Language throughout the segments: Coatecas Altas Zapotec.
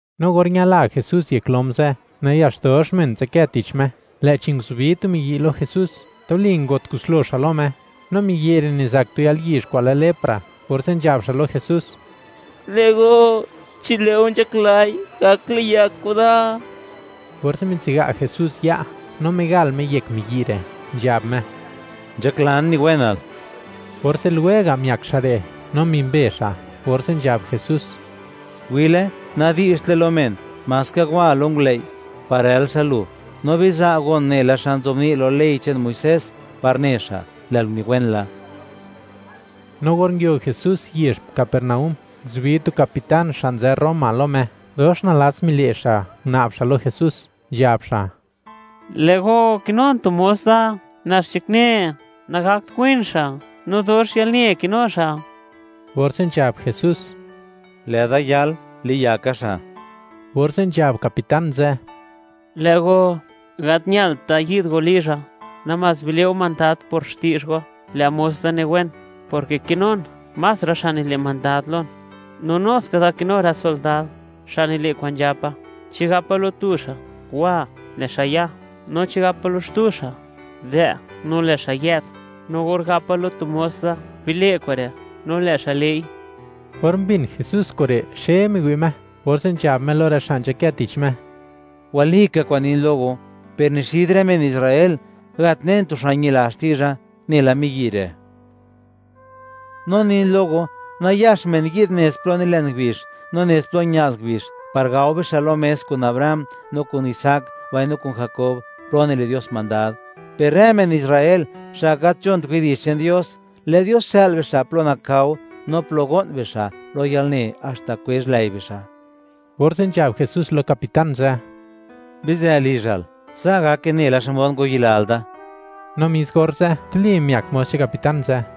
No or ñala Jesús yek lom ze', nayax dox men nzadkë tich Me, lë'chi nguzubi tu miyi' lo Jesús, tuli ngo't kuslo xa' lo Me; no miyi' re' nizak tu yalyizh kwa'n lë lepra, orze' nzhab xa' lo Jesús: ―Lë' go, chi lë'o nzhaklai, gak liyak go da. Orze' mitsiga' Jesús ya', no migal Me yek miyi' re', nzhab Me: ―Nzhaklan niwenal. Orze' lwega' miak xa' re', no mimbe xa', orze' nzhab Jesús: ―Wi'le, nadi'zhtle lo men, maska wa lo ngulëi' par rël xa' lu, no biza' gon nela xa nzobni' lo ley che'n Muisés par ne xa', lë'l uniwen la. No or nguio Jesús yezh Capernaúm, nguzubi tu capitán xa' nzë Roma lo Me, dox nalats mile' xa', nguna'b xa' lo Jesús, nzhab xa': ―Lë' go, kinun tu mos da, nax nzhakne, nagakt win xa', no dox yalne kinu xa'. Orze' nzhab Jesús: ―Lë'da yal, liyaka xa'. Orze' nzhab capitán ze': ―Lë' go, gat ñalt da yi'd go lizha; namás bile' go mandad por xti'zh go, lë' mos da niwen, porke kinun más rë xa' nile' mandad lon, no nu ska da kinu rë sondad xa' nile' kwa'n nzhapa; chi gapa lo tu xa': “Wa”, lë' xa' ya; no chi gapa lo xtu xa': “Dë'”, no lë' xa' yë'd; no or gapa lo tu mos da: “Bile' kure'”, no lë' xa' le'i. Or mbin Jesús kure', xe miwi' Me, orze' nzhab Me lo rë xa' nzhakë tich Me: ―Walika kwa'n nin lo go; per ni xid rë men Israel gat nen tu xa' ñila xti'zha nela miyi' re', no nin lo go, nayax men yi'd nez plo nilen ngubizh, no nez plo ña'z ngubizh, par gao bixa' lo mes kun Abraham no kun Isaac, mbaino kun Jakob plo nile' Dios mandad, per rë men Israel xa' gat nzhont widi'zh che'n Dios, lë' Dios xë'l bixa' plo nakao no plo go'n bixa' lo yalne, haxta kwezh lëi bixa'. Orze' nzhab Jesús lo capitán ze': ―Bizë lizhal; sa' gake nela xmod ngwayilal da. No mis orze', tuli miak mos che'n capitán ze'.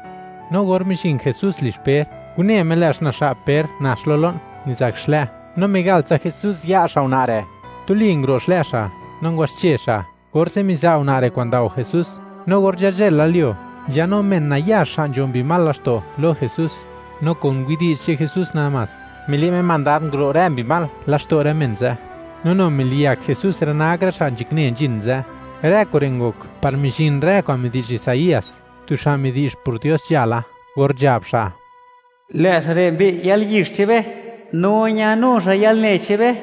No or mizhin Jesús lizh Per, une Me, lë' xna'zha'p Per nax lo lo'n, nizak xlë', no migal tsa Jesús ya' xa' una' re', tuli nguro' xlë' xa', no ngwaxche xa', orze' miza' una' re' kwa'n ndao Jesús. No or nzhazhëlalyuo, nzhanu men nayax xa' nzho mbi mal laxto', lo Jesús; no kun widi'zh che'n Jesús namás, mile' Me mandad nguro' rë mbi mal laxto' rë men ze'; no nu miliyak Jesús rë nak rë xa' nzhakne nzhin ze'. Rë kure' ngok par mizhin rë kwa'n midi'zh Isaías, tu xa' midi'zh por Dios nzhala, or nzhab xa': “Lë' xa' re' mbi'y yalyizh che'n be, no ñanu xa' yalne che'n be.”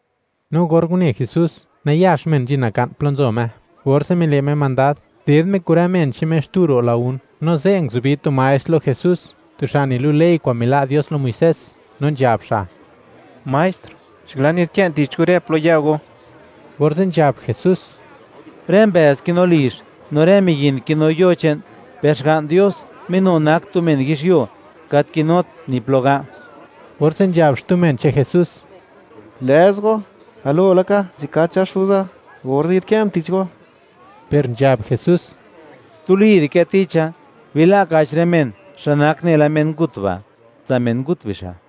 No or une Jesús, nayax men nzhin naka'n plo nzo Me, orze' mile' Me mandad, ded Me kun rë men che'n Me xtu ro' lagún, no ze' nguzubi tu maestr lo Jesús, tu xa' nilu' ley kwa'n mila' Dios lo Muisés, no nzhab xa': ―Maestr, nzhaklan yi'd kë'n tich go rë plo ya go. Orze' nzhab Jesús: ―Rë mbëëz kinu lizh, no rë miyin kinu yo che'n, per Xga'n Dios Me nu nak tu men yizhyuo, gat kinut ni plo ga'. Orze' nzhab xtu men che'n Jesús: ―Gulëz go, galo laka nzhakacha xuza, orze' yi'dkë'n tich go. Per nzhab Jesús: ―Tuli di'kë ticha, bila' ka'ch rë men, xa' nak nela men ngut ba', tsa' men ngut bixa'.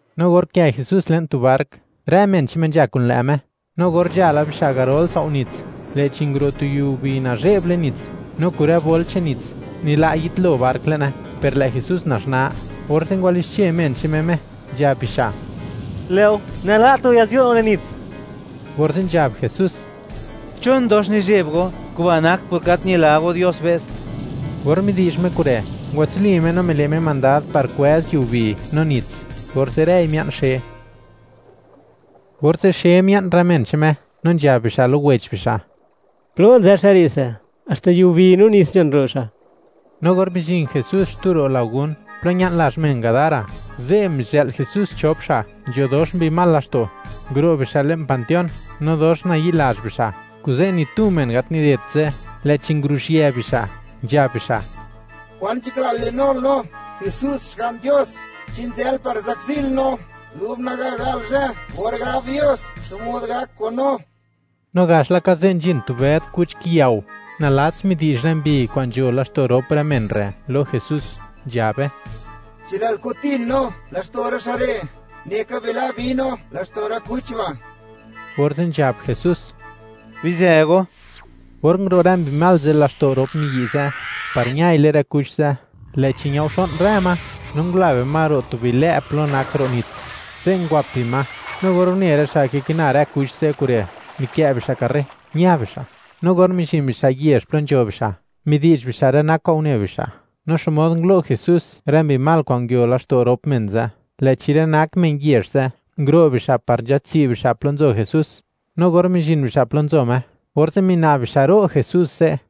No or nkë Jesús le'n tu bark, rë men che'n Me nzha kun lë' Me. No or nzha la bixa' garol sao' nits, lë'chi nguro' tu yiubi nazhe'b le'n nits, no kun rë bol che'n nits, nila' yitlo bark le'ne, per lë' Jesús naxnaa, orze' ngwalixche men che'n Me Me, nzhab bixa': ―¡Lë'o, nala't go ya'zyuo' no le'n nits! Orze' nzhab Jesús: ―¿Chon dox nizheb go? Kuba' nak por gat ñila go Dios be's. Or midi'zh Me kure', ngwatsuli Me no mile' Me mandad par kwëz yiubi no nits, orze' rëi mia'n xe, orze' xe mia'n rë men che'n Me, no nzhab bixa' lo wech bixa': ―¿Plo nzë xa' re' se? ¡Haxta yiubi no nits nzhon ro' xa'! No or mizhin Jesús xtu ro' lagún, plo ña'n lazh men Gadara, ze' mizhë'l Jesús chop xa' nzho dox mbi mal laxto'; nguro' bixa' le'n panteón, no dox nayi'lazh bixa', kuze' ni tu men gat nidedt ze', lë'chi nguruzhië bixa', nzhab bixa': ―¿Kwan nzhaklal linul no, Jesús Xga'n Dios? ¿Chi nzë'l par zakzil no dub naga gal zhë or gab Dios xmod gak kun no? No gax laka ze' nzhin tu bëd kuch kiyao; nalats midi'zh rë mbi kwa'n nzho laxto' rop rë men re' lo Jesús, nzhabe: ―Chi lë'l kutin no laxto' rë xa' re', neka bila' bi no laxto' rë kuch ba'. Orze' nzhab Jesús: ―¡Bizë go! Or nguro' rë mbi mal ze' laxto' rop miyi' ze', par ñai le'n rë kuch ze', lë'chi ñaoxo'n rë ma, no ngula bima ro' tu bilë' plo nak ro' nits, ze' ngwap bima, no or une rë xa' kikina rë kuch ze' kure', mikë' bixa' karre, ña bixa'; no or mizhin bixa' yezh plo nzho bixa', midi'zh bixa' rë nak kwa'n une bixa', no xmod ngulo' Jesús rë mbi mal kwa'n nguio laxto' rop men ze', lë'chi rë nak men yezh ze' nguro' bixa' par nzhatsi' bixa' plo nzo Jesús; no or mizhin bixa' plo nzo Me, orze' mina'b bixa' ro' Jesús ze'.